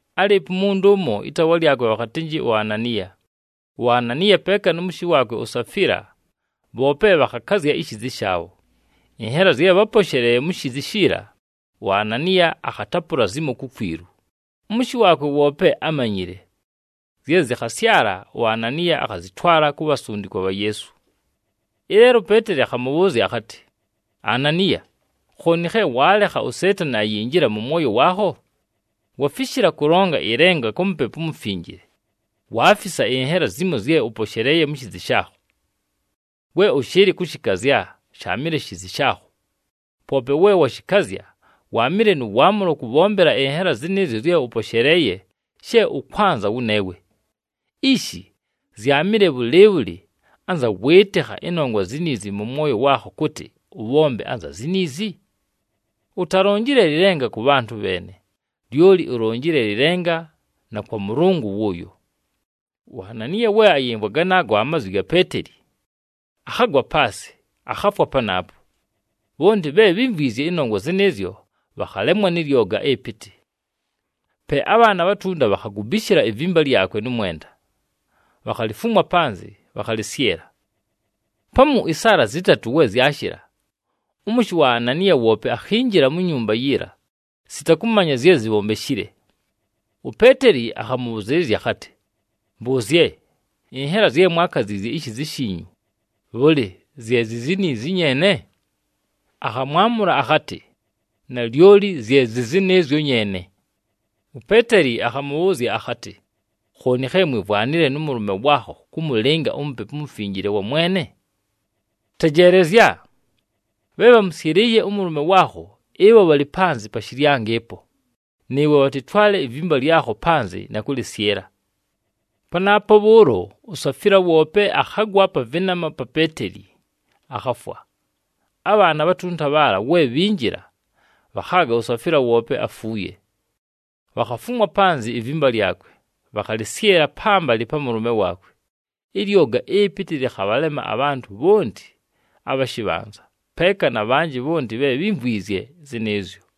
Álɨɨpo umuntu ʉmo, ɨtaawa lyakwe bhakhatɨnjɨ uAnaniya. UAnaniya peeka nʉ mʉshɨ waakwe uSafila, bhoope bhakhakazya ishiizi shaabho. Ɨnhela zye bháposheleeye mu shiizi shiila, uAnaniya akhatapʉla zimo kukwilu, ʉmʉshɨ waakwe woope ámanyile. Zye zɨkhasyala, uAnaniya akhazɨtwala ku bhasundikwa bha Yeesu. Ɨleelo uPeeteli akhamʉbhʉʉzya akhatɨ, “Ananiya! Khooni khe waalekha uSeetani ayinjila mʉ mwoyo waakho? Wafishila kʉlonga ɨlenga kwa Mupepu uMufinjile, waafisa ɨnhela zimo zye ʉposheleeye mu shiizi shaakho. We ʉshɨɨlɨ kʉshɨkazya, sháamɨle shiizi shaakho! Poope we washɨkazya, waamɨle nʉ waamʉlo kʉbhombela ɨnhela zɨnɨɨzyo zye ʉposheleeye she ʉkwanza wʉneewe! Ishi! Zyaamɨle bhʉlɨɨbhʉlɨ anza wɨɨtɨkha ɨnongwa ziniizi mʉ mwoyo waakho kʉtɨ ʉbhombe anza ziniizi? Utalonjile lɨlenga kʉ bhantʉ bheene, lyoli ulonjile lɨlenga na kwa Mʉlʉngʉ wʉʉyo!” UAnaniya we ayɨmvwa ganaago amazwi ga Peeteli, akhagwa paasɨ, akhafwa panaapo. Bhonti bhe bhímvwizye ɨnongwa zɨnɨɨzyo bhakhalemwa nɨ lyoga ɨpɨtɨ. Pe abhaana abhatunta bhakhagubishila ivimba lyakwe nʉ mwenda, bhakhalifumwa panzɨ, bhakhalɨsyɨla. Pamu ɨsaala zɨtatʉ we zyashɨla, ʉmʉshɨ wa Ananiya woope akhinjila mu nyumba yiila, sita kʉmanya zye zibhombeshile. UPeeteli akhamʉbhʉzɨɨlɨzya akhatɨ, “Mbʉʉzye, ɨnhela zye mwaakaziizye ishiizi shiinyu, bhʉlɨ zye zi ziniizi nyeene?” Akhamwamʉla akhatɨ, “Nalyoli zye zɨ zɨnɨɨzyo nyeene!” UPeeteli akhamʉbhʉʉzya akhatɨ, “Khooni khe mwivwanile nʉ mʉlʉme waakho kʉmʉlɨnga uMupepu uMufinjile wa Mwene? Tejeelezya! Bhe bhamʉsyɨlɨɨye ʉmʉlʉme waakho, ɨbho bhalɨ panzɨ pa shɨlyango ɨpo, nɨɨwe bhatɨtwale ivimba lyakho panzɨ na kʉlɨsyɨla.” Panaapo bhʉʉlo, uSafila woope akhagwa pa vɨnama pa Peeteli, akhafwa. Abhaana abhatunta bhaala we bhinjila, bhakhaaga uSafila woope afuuye. Bhakhafumwa panzɨ ivimba lyakwe, bhakhalɨsyɨla pambalɨ pa mʉlʉme waakwe. Ɨlyoga ɨpɨtɨ lɨkhabhalema abhantʉ bhonti abha shɨbhanza, peeka na bhanjɨ bhonti bhe bhímvwizye zɨnɨɨzyo.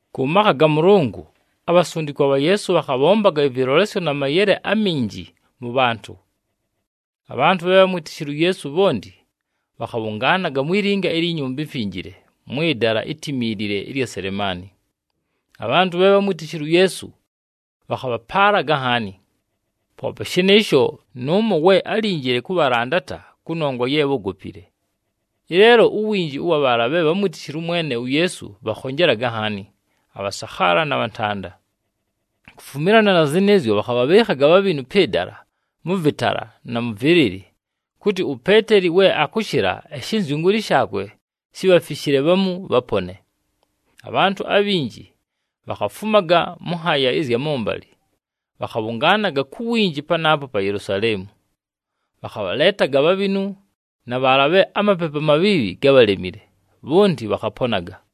Kʉ makha ga Mʉlʉngʉ, abhasundikwa bha Yeesu bhakhabhombaga ɨvɨlolesyo na mayele aminji mʉ bhantʉ. Abhantʉ bhe bhámwitishile uYeesu bhonti bhakhabhʉngaanaga mwi linga ilyi Nyumba iMfinjile, mwɨ dala itimiilile ɨlya Selemaani. Abhantʉ bhe bhatámwitishile uYeesu bhakhabhapaalaga nhaani. Poope shɨnɨɨsho, nʉʉmo we álinjile kʉbhalandata kʉnongwa ye bhógopile. Ɨleelo uwinji wa bhaala bhe bhámwitishile ʉMwene uYeesu bhakhonjelaga nhaani, abhasakhaala na bhantanda. Kufumilana na zɨnɨɨzyo, bhakhabhabhɨɨkhaga abhabhinu pɨ dala mʉ vɨtala, na mʉ vɨlɨlɨ, kʉtɨ uPeeteli we akʉshɨla, ɨshɨnzyʉngʉʉlɨ shaakwe shibhafishile bhamu bhapone. Abhantʉ abhinji bhakhafumaga mʉ nhaaya ɨzya mʉmbalɨ, bhakhabhʉngaanaga ku winji panaapo pa Yelusaleemu. Bhakhabhaleetaga abhabhinu, na bhaala bhe amapepu amabhiibhi gábhalemile, bhonti bhakhaponaga.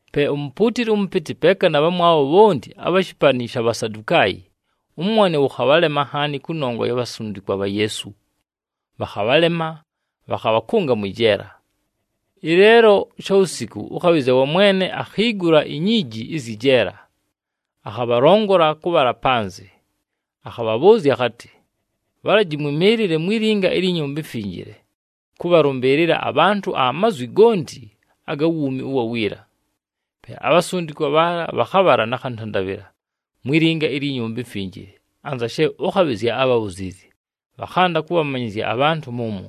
Pe umupuutili ʉmʉpɨtɨ, peeka na bhamwabho bhonti abha shɨpanɨ sha Bhasadukaayi, ʉmwone wʉkhabhalema nhaani kʉnongwa ya bhasundikwa bha Yeesu. Bhakhabhalema, bhakhabhakʉnga mwɨ jeela. Ɨleelo shawusiku ʉkhabhɨzya wa Mwene akhiigula inyiiji ɨzyɨ jeela, akhabhalongola kʉbhala panzɨ. Akhabhabhʉʉzya akhatɨ, “Bhalaji mwɨmɨɨlɨle mwi linga ilyi Nyumba iMfinjile, kʉbhalʉmbɨɨlɨla abhantʉ amazwi gonti aga wuumi ʉwa wiila.” Pe abhasundikwa bhaala bhakhabhala nakhantandabhɨla mwi linga ilyi Nyumba iMfinjile, anza she ʉkhabhɨzya ábhabhuziizye, bhakhanda kʉbhamanyɨzya abhantʉ mʉmwo.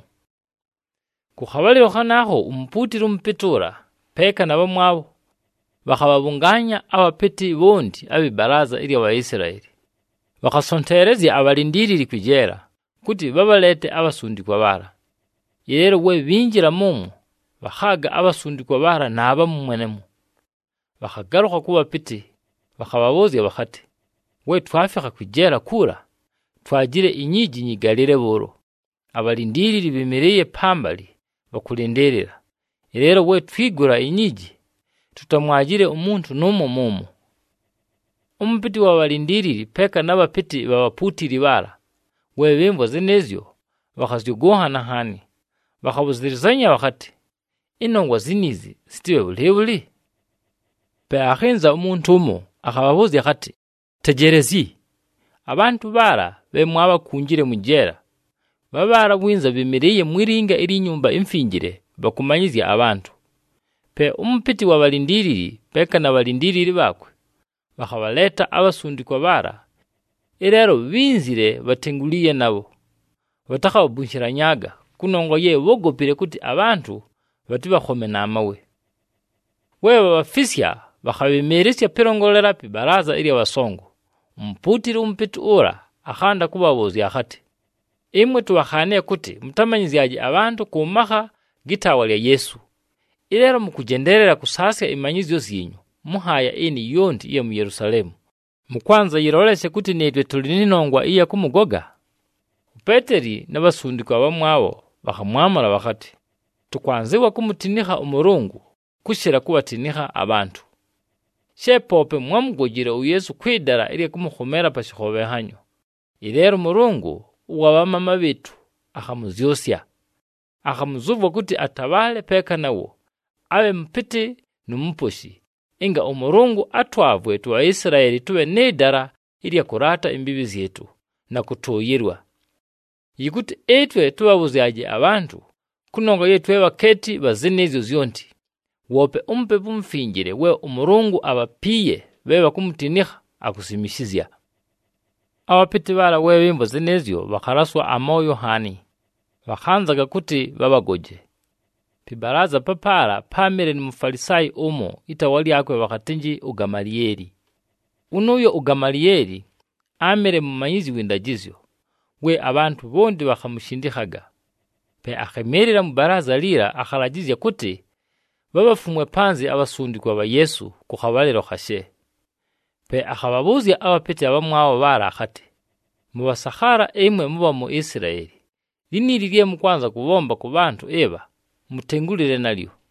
Kʉ khabhalɨlo khanaakho umupuutili ʉmʉpɨtɨ ʉla, peeka na bhamwabho, bhakhabhabhʉngaanya abhapɨtɨ bhonti abhɨ balaaza ɨlya Bhaisilaeli. Bhakhasonteelezya abhalindiilili kwɨ jeela, kʉtɨ bhabhaleete abhasundikwa bhaala. Ɨleelo we bhinjila mʉmwo, bhakhaaga abhasundikwa bhaala naabhamu mwenemwo. Bhakhagalʉkha kʉ bhapɨtɨ, bhakhabhabhʉʉzya bhakhatɨ, “We twafikha kwɨ jeela kuula, twajile inyiiji nyɨgalɨle bhʉʉlo, abhalindiilili bhɨmɨlɨɨye pambalɨ bhakʉlɨndɨɨlɨla. Ɨleelo we twigula inyiiji, tutamwajile umuntu nʉʉmo mʉmwo!” Ʉmʉpɨtɨ wa bhalindiilili peeka na bhapɨtɨ bha bhapuutili bhaala, we bhɨmvwa zɨnɨɨzyo, bhakhazyʉgʉnhana nhaani, bhakhabhʉzɨlɨzanya bhakhatɨ, “Ɨnongwa ziniizi zɨtɨbhe bhʉlɨɨbhʉlɨ?” Pe akhɨnza umuntu ʉmo, akhabhabhʉʉzya akhatɨ, “Tejeelezyi! Abhantʉ bhaala bhe mwaabhakunjile mwɨ jeela, bhabhaala winza bhɨmɨlɨɨye mwi linga ilyi Nyumba iMfinjile bhakʉmanyɨzya abhantʉ.” Pe ʉmʉpɨtɨ wa bhalindiilili, peeka na bhalindiilili bhaakwe, bhakhabhaleeta abhasundikwa bhaala. Ɨleelo bhínzile bhatenguliiye nabho, bhatakhabhabunshilanyaaga, kʉnongwa ye bhógopile kʉtɨ abhantʉ bhatɨbhakhome na mawe. We bhabhafisya, bhakhabhɨmɨɨlɨsya pɨlongolela pɨ balaaza ɨlya bhasongo, umupuutili ʉmʉpɨtɨ ʉla akhanda kʉbhabhʉʉzya akhatɨ, “Ɨmwe tubhakhaanile kʉtɨ mʉtamanyɨzyaje abhantʉ kʉ makha gɨ taawa lya Yeesu! Ɨleelo mʉkʉjendeelela kʉsaasya ɨmanyɨzyo zyinyu mʉ nhaaya ɨnɨ yonti ɨya mu Yelusaleemu, mʉkwanza yɨloleshe kʉtɨ nɨɨtwe tʉlɨ nɨ nongwa ɨya kʉmʉgoga!” UPeeteli na bhasundikwa abhamwabho bhakhamwamʉla bhakhatɨ, “Tʉkwanzɨwa kumutinikha ʉMʉlʉngʉ, kʉshɨla kubhatinikha abhantʉ! She poope mwámugojile uYeesu kwɨ dala ɨlya kʉmʉkhomeela pa shɨkhobhenhanyo, ɨleelo ʉMʉlʉngʉ ʉwa bhamaama bhɨɨtʉ akhamʉzyʉsya. Akhamʉzʉvwa kʉtɨ atabhaale peeka nawo, abhe Mʉpɨtɨ nu Muposhi, ɨnga ʉMʉlʉngʉ atwavwe tuBhaisilaeli tʉbhe nɨ dala ɨlya kʉlaata imbiibhi zyɨtʉ, na kʉtʉʉyɨlwa. Yɨkʉtɨ ɨtwe tʉbhabhʉzyaje abhantʉ, kʉnongwa ye twe bhakeeti bha zɨnɨɨzyo zyonti, woope uMupepu uMufinjile, we ʉMʉlʉngʉ abhapiiye bhe bhakumutinikha, akusimishizya.” Abhapɨtɨ bhaala we bhɨmvwa zɨnɨɨzyo, bhakhalaswa amooyo nhaani, bhakhanzaga kʉtɨ bhabhagoje. Pɨ balaaza papaala páamɨle nu Mufalisaayi ʉmo, ɨtaawa lyakwe bhakhatɨnjɨ uGamalieli. Wʉnʉʉyo uGamalieli áamɨle mumanyizyi wɨ ndajɨzyo, we abhantʉ bhonti bhakhamushindikhaga. Pe akhɨmɨɨlɨla mwɨ balaaza liila, akhalajɨzya kʉtɨ bhabhafumwe panzɨ abhasundikwa bha Yeesu kʉ khabhalɨlo khashe. Pe akhabhabhʉʉzya abhapɨtɨ abhamwabho bhaala akhatɨ, “Mʉbhasakhaala ɨmwe mʉbha mu Isilaeli, liniili lye mʉkwanza kʉbhomba kʉ bhantʉ ɨbha, mutengulile nalyo.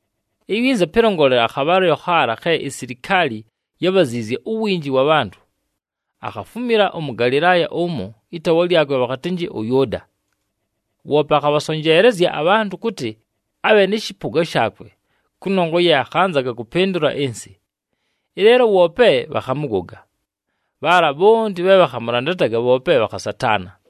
Iwinza pɨlongolela, akhabhalɨlo khaala khe isilikaali yábhaziizye uwinji wa bhantʉ, akhafumila ʉMʉgalɨlaaya ʉmo, ɨtaawa lyakwe bhakhatɨnjɨ ʉYʉʉda. Woope akhabhasonjeelezya abhantʉ kʉtɨ abhe nɨ shɨpʉga shaakwe kʉnongwa ye akhanzaga kʉpɨndʉla ɨnsɨ. Ɨleelo woope bhakhamʉgoga, bhaala bhonti bhe bhakhamʉlandataga bhoope bhakhasataana.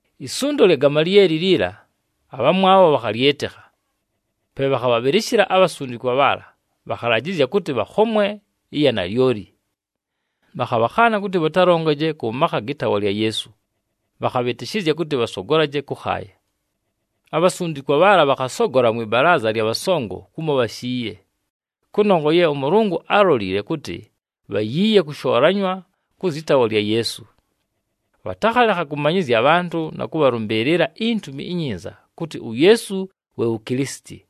Isundo lya Gamalieli liila, abhamwabho bhakhalyɨtɨkha. Pe bhakhabhabhɨlɨshɨla abhasundikwa bhaala, bhakhalajɨzya kʉtɨ bhakhomwe ɨya nalyoli. Bhakhabhakhaana kʉtɨ bhatalongaje kʉ makha gɨ taawa lya Yeesu, bhakhabhɨtɨshɨzya kʉtɨ bhasogolaje kʉkhaaya. Abhasundikwa bhaala bhakhasogola mwɨ balaaza lya bhasongo kumo bhashiiye, kʉnongwa ye ʉMʉlʉngʉ álolile kʉtɨ bhayiiye kʉshoolanywa kʉ zyɨ taawa lya Yeesu. Bhatakhalekha kʉmanyɨzya abhantʉ na kʉbhalʉmbɨɨlɨla iNtumi iNyinza kʉtɨ uYeesu we wu Kilisiti.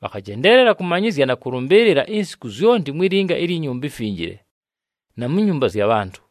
Bhakhajendeelela kʉmanyɨzya na kʉlʉmbɨɨlɨla insiku zyonti mwi linga ilyi Nyumba iMfinjile, na mu nyumba zya bhantʉ.